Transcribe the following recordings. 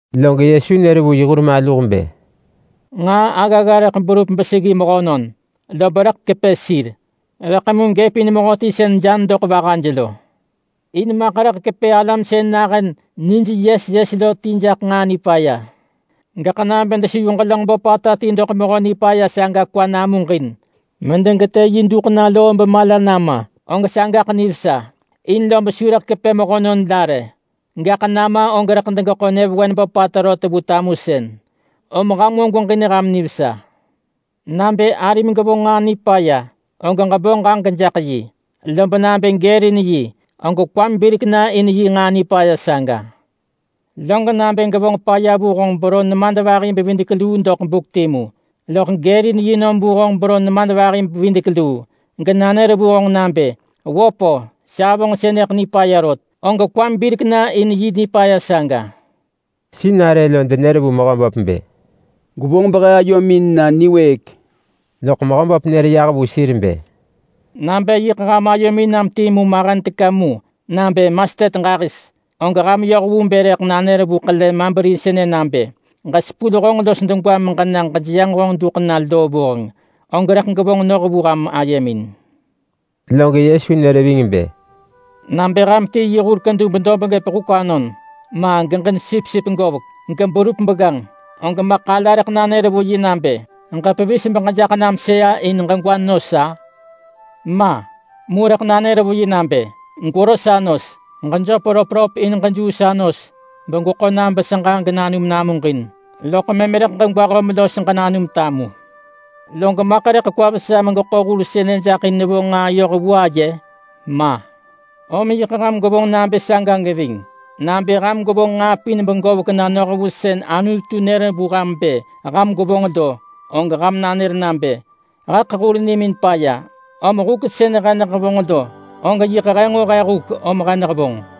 Log Yesu nër vu yi hur maluh bë, “Nġaa aggagga rëḳ berup beseggi mehönon, lob rëḳ kepë sir. Rëḳ mu gëpin mehöti sën jan doḳ vahaj lo! In maḳ rëḳ kepë alam sën nahën nij yes yes lo ti jaḳ nġaa nipaya. Gaḳ nabë deseyu ġelönġ böpata ti doḳ mehö nipaya saga kwa namuġin medegetë yi duḳ na loo bemala nama, og sagaḳ nivesa in lob su rëḳ kepë mehönon la rë, gaḳ nama og rëḳ geḳo nyëvewen böpata rot vu tamusën. Om ham nġo gweġin ham nivesa. Nabë arim gevonġ nġaa nipaya, og ġebo ġaġek jaḳ yi. Lob nabë gërin yi, og kwam birek na in yi nġaa nipaya saga. Log nabë gevonġ paya vu honġ beron nemadvahi-bevidek-luu doḳ buk timu, loḳ gërin yi nom vu honġ beron nemadvahi-bevidek-luu genanër vu honġ nabë, ‘Wöp-o, sa hevonġ sënëḳ nipaya rot.’ Og kwam birek na in yi nipaya saga.” Sinarë lo denër vu Mehöböp bë, “Gwevonġ behe ayomin na niwëëk.” Loḳ Mehöböp nër yah vu sir bë, “Nabë yiḳ ham ayomin nam timu mahen teka mu nabë mastet ġahis, og ham yoh vu bë rëḳ nanër vu ḳele malberi sënë nabë, ‘Ġesepul honġ los degwam meġena ġejeyanġ honġ duḳ na loo vuheng’, og rëḳ gevonġ noh vu ham ayemin.” Log Yesu nër ving bë, “Nabë ham ti yi hur kedub dob gëp huk anon, ma geġin sipsip govek geberup begganġ, og maḳ ala rëḳ nanër vu yi nabë, ‘Ġepevis beġejaḳ nam sëa in ġegwa nos’—a? Ma! Mu rëḳ nanër vu yi nabë, ‘Gwero sa nos. Ġejöp röpröp in ġejuu sa nos begweḳo nam beseġa genanum namuġin, loḳ mëm rëḳ ġegwa höm los ġenanum tamu.’ Log maḳ rëḳ kwa vesa megeḳo hur sënë jaḳ in nevonġ nġaa yoh vu aye? Ma! Om yiḳ ham gwevonġ nabë saga geving. Nabë ham gwevonġ nġaa pin begovek na noh vu sën Anutu nër vu ham bë ham gwevonġ lo, og ham nanër nabë, ‘Heḳ hur nimin paya. Om huk sën he nehevonġ lo, og yiḳ he nġo he huk om he nehevonġ.’”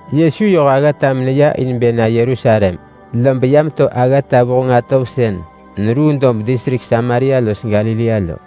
Yesu yoh aggata meneya in bë na Yerusalem, lob ya meto aggata vuheng atov sën neruu dob distrik Samaria los Galilea lo.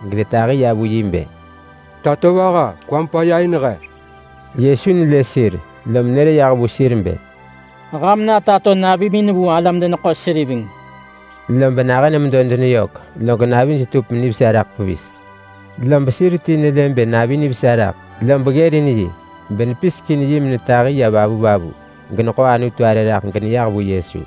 gedetahi ya vu yi bë, “Tatovaha, kwam paya in he!” Yesu nelë sir, lom nër yah vu sir bë, “Ham na tato navimin vu alam-deneḳo-seriveng.” Lob nahën medo deneyök, log navij tup nivesa raḳ pevis. Lob sir ti nelë bë navi nivesa raḳ, lob ggërin yi benepisek in menetahi ya vavunë, geneḳo Anutu arë raḳ geneyah vu Yesu.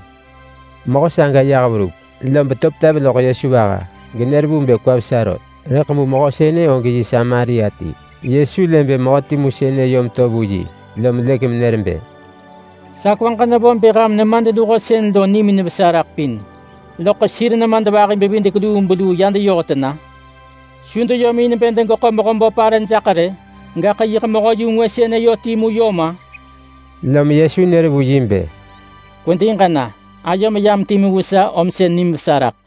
Mehö saga yah verup, lob to petev loḳ Yesu vaha genër vu bë kwa vesa rot. Rëḳ mu mehö sënë og Samaria ti. Yesu lë bë mehö timu sënë yom to vu yi, lom lëk menër bë, “Sa kwaġ nevo bë ham nemadluho sën lo nimin vesa raḳ pin, loḳ sir nemadvahi-bevidek-lubeluu ya deyoh tena? Su deyom in bë degeḳo Mehöböp arë jaḳ rë? Gaḳ yiḳ mehö-yu-ngwë sënë yö timu yom-a?” Lom Yesu nër vu yi bë, “Kwedi ġena! Ayom yam timu vu sa om sën nim vesa raḳ.”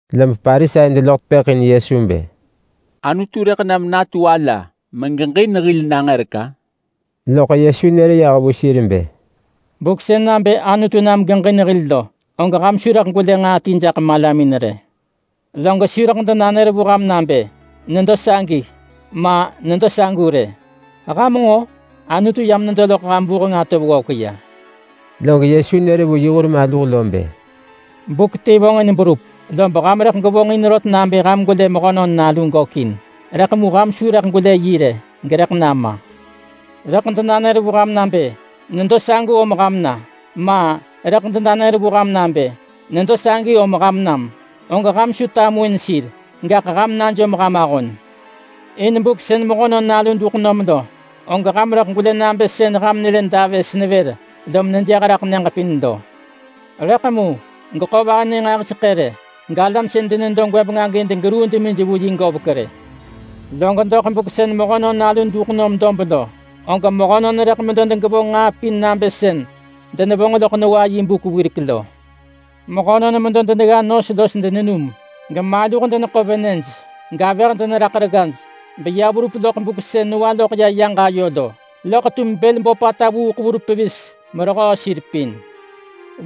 Lob Parisai deloḳ tepëḳ in Yesu bë, “Anutu rëḳ nam natu ala megeġin hil nangërek-a? Loḳ Yesu nër yah vu sir bë, “Buk sën nabë Anutu nam geġin hil lo, og ham su rëḳ gwelë nġaa ti jaḳ malamin rë. Log su rëḳ denanër vu ham nabë ‘Nedo sagi!’ ma, ‘Nedo sagu!’ rë. Ham nġo? Anutu yam nedo loḳ ham vuheng atov ggovek ya.” Log Yesu nër vu yi hur maluh lo bë, “Buk ti vonġin berup, lob ham rëḳ gwevonġ in rot nabë ham gwelë Mehönon Nalu gökin, rëḳ mu ham su rëḳ gwelë yi rë gerëḳ nama. Rëḳ denanër vu ham nabë, ‘Nedo sagu om ham na!’ ma, rëḳ denanër vu ham nabë, ‘Nedo sagi om ham nam!’ og ham su tamuin sir, gaḳ ham najom ham ahon! In buk sën Mehönon Nalu duḳ nom lo, og ham rëḳ gwelë nabë sën ham nelë davës nevër lom nejëh raḳ nyëġ pin lo. Rëḳ mu geḳo nivanë nġahiseḳë rë, galam sën denedo gwëbeng agi degeruu demij vu yi govek rë. Log doḳ buk sën Mehönon Nalu duḳ nom dob lo, og mehönon rëḳ medo denegevonġ nġaa pin nabë sën denevonġ loḳ Noa yi buk wirek lo. Mehönon medo denegga nos los denenum, gemaluh deneḳo venëj, gavëh deneraḳ reggaj, beya verup loḳ buk sën Noa loḳ ya yaġ ayo lo, loḳ tum bël böpata vuuḳ verup pevis merehöö sir pin.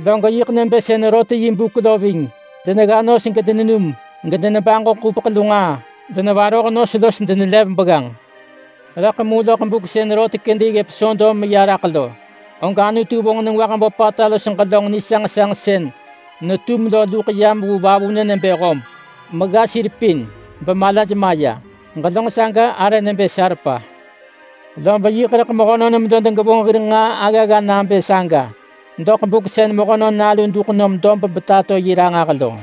Log yiḳ rëḳ nabë sën Lot yi buk lo geving. Denegga nos gedenenum gedenebaġo ḳupeḳ lu nġaa. Denevaroh nos los denelev begganġ. Rëḳ mu loḳ buk sën Lot kedi ggëp Sodom meya raḳ lo, og Anutu vonġ nengwah böpata los ġelönġ nisanġsanġ sën netum lo luḳ yam vu vavunë nebë hob megga sir pin bemalaj maya. Ġelönġ saga arë nebë salpa. Lob yiḳ rëḳ mehönon medo denegevonġ hir nġaa aggagga nabë saga doḳ buk sën Mehönon Nalu duḳ nom dob betato yi ranġah lo.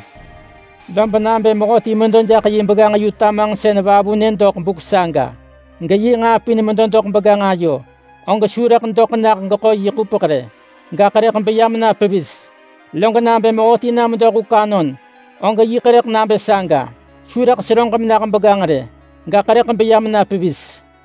Lob nabë mehöti jaḳ na sewah jaḳ yi begganġ yu tamanġsën vavunë megeḳo ayööng doḳ buk saga, geyi nġaa pin doḳ medo begganġ ayo, og su doḳ nah geḳo yi ḳupeḳ doḳ begganġ ayo, gaḳ beya mena pevis. Log nabë mehöti na medo huk anon, og yiḳ nabë saga, su seröġ menah begganġ, gaḳ beya mena pevis.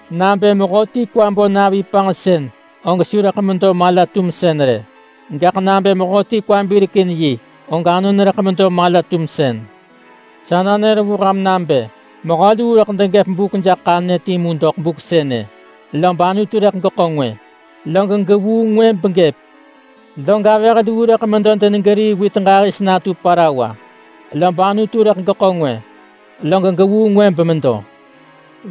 Nabë mehöti kwa bo navi panġsën og su rëḳ medo mala-tumsën rë. Gaḳ nabë mehöti kwa birek in yi, og anon rëḳ medo mala-tumsën. Sa nanër vu ham nabë: Mehö luu rëḳ degëp buk jaḳ ḳanyë timu doḳ buk sënë, lob Anutu rëḳ geḳo ngwë, log gevuu ngwë begëp. Log avëh luu rëḳ medo denegerii wit ġahis natu parawa, lob Anutu rëḳ geḳo ngwë, log gevuu ngwë bemedo.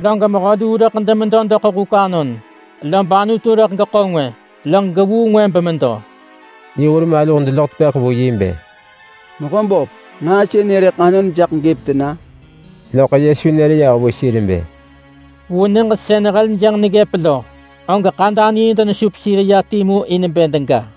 [Log mehö luu rëḳ demedo doḳ huk anon, lob Anutu rëḳ geḳo ngwë, log gevuu ngwë bemedo].” Yi hur maluh deloḳ tepëḳ vu yi bë, “Mehöböp, nġaa sënë rëḳ anon jaḳ gëp tena?” Loḳ Yesu nër yah vu sir bë, “Vu nyëġ sën heljënġ neggëp lo, og ḳadanii denesup sir ya timu in bë dega.”